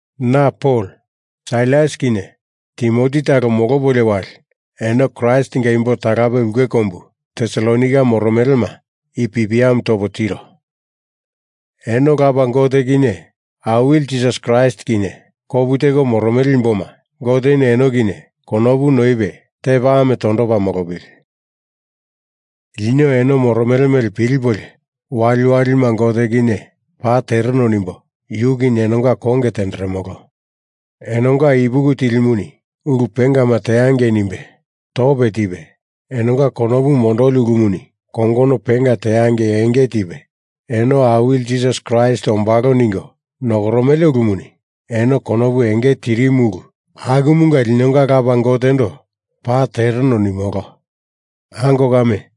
Na Pol, Sailas kinye Timoti talo molopolio wali eno Kraistinga imbo talape ulke kombu Tesalonaika moromelema i pipiamu topo tiro. Eno Lapa Gote kinye Awili Jisas Kraist kinye kopu teko moromele imboma, Goteni eno kinye konopu noipe tepa ame tondopa molopili. Lino eno moromele mele pilipolio waliwalima Gote kinye paa tereno nimbo, yu kinye enonga konge tenderemolo. Enonga ipuki tilimuni ulu pengama teangei nimbe tope tipe, enonga konopu mondoli ulumuni kongono penga teangei enge tipe, eno Awili Jisas Kraist ombalo ningo nokoromele ulumuni eno konopu enge tirimu ulu akumanga linonga Lapa Gotendo paa tereno nimolo. Ango kame,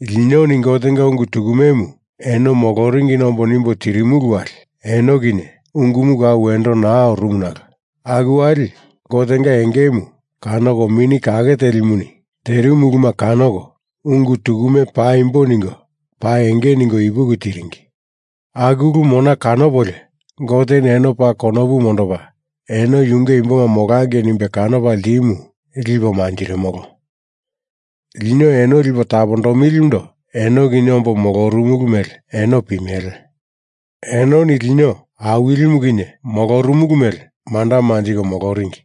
linoni Gotenga ungu tukumemu eno moloringina ombo nimbo tirimulu wali eno kinye ungumu kau wendo naa orumu nalo aku wali Gotenga engemu kanoko Mini Kake Telimuni terimu uluma kanoko ungu tukume paimbo ningo paa enge ningo ipuki tiringi. Aku ulu mona kanopolio Goteni eno paa konopu mondopa eno yunge imboma molangei nimbe kanopa ltimu lipo manjirimolo. Lino eno lipo tapondomilindo eno kinye ombo molorumulu mele eno pimele. Enoni lino Awilimu kinye molorumulu mele manda manjiko moloringi.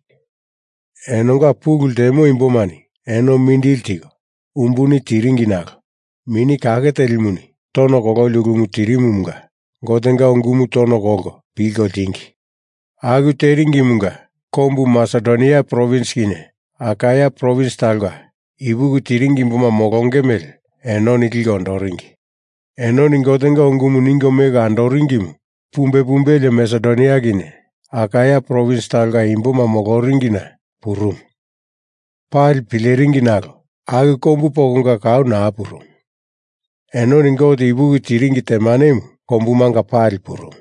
Enonga pulu ltemo imbomani eno mindili tiko umbuni tiringi nalo Mini Kake Telimuni tono kololi ulumu tirimumunga Gotenga ungumu tono kolko pilko ltingi. Aku teringimunga kombu Masedonia provins kinye Akaia provins talonga ipuki tiringi imboma molonge mele enoni liko ondoringi. Enoni Gotenga ungumu ningo meko andoringimu pumbe pumbelie Masedonia kinye Akaia provins talonga imboma moloringina purumu, pali pileringi nalo aku kombu pokonga kau naa purumu. Enoni Gote ipuki tiringi temanemu kombumanga pali purumu.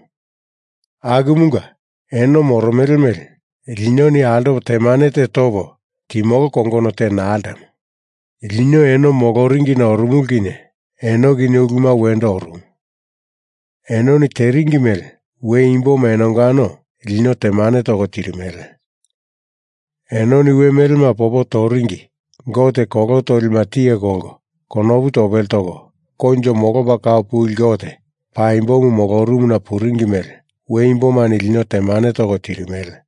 Akumunga eno moromele mele linoni altopo temane te topo timolo kongono te naa ltemo. Lino eno moloringina orumulu kinye eno kinye uluma wendo orumu, enoni teringi mele we imboma enongano lino temane toko tirimele. Enoni we melema popo toringi gote kolo tolima tiye kolko konopu topele toko, koinjo molopa kau puli Gote paimbomu molorumuna puringi mele we imbomani lino temane toko tirimele.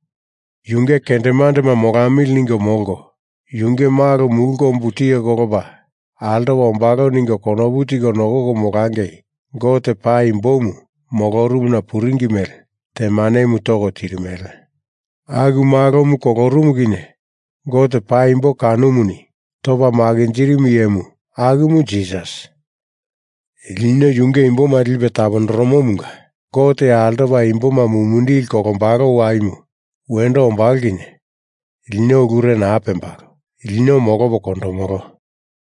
Yunge kendemandema molamili ningo molko, yunge Malo mulu kombumu tiye kolopa altopa ombalo ningo konopu tiko nokoko molongei Gote paimbomu molorumuna puringi mele temanemu toko tirimele. Aku Malomu kolorumu kinye Gote paimbo kanomuni topa makinjirimu iyemu akumu Jisas. Lino yunge imboma lipe tapondoromomunga Gote altopa imboma mumindili kolombalo waimu wendo ombalo kinye lino ulure naa pembalo, lino molopo kondomolo.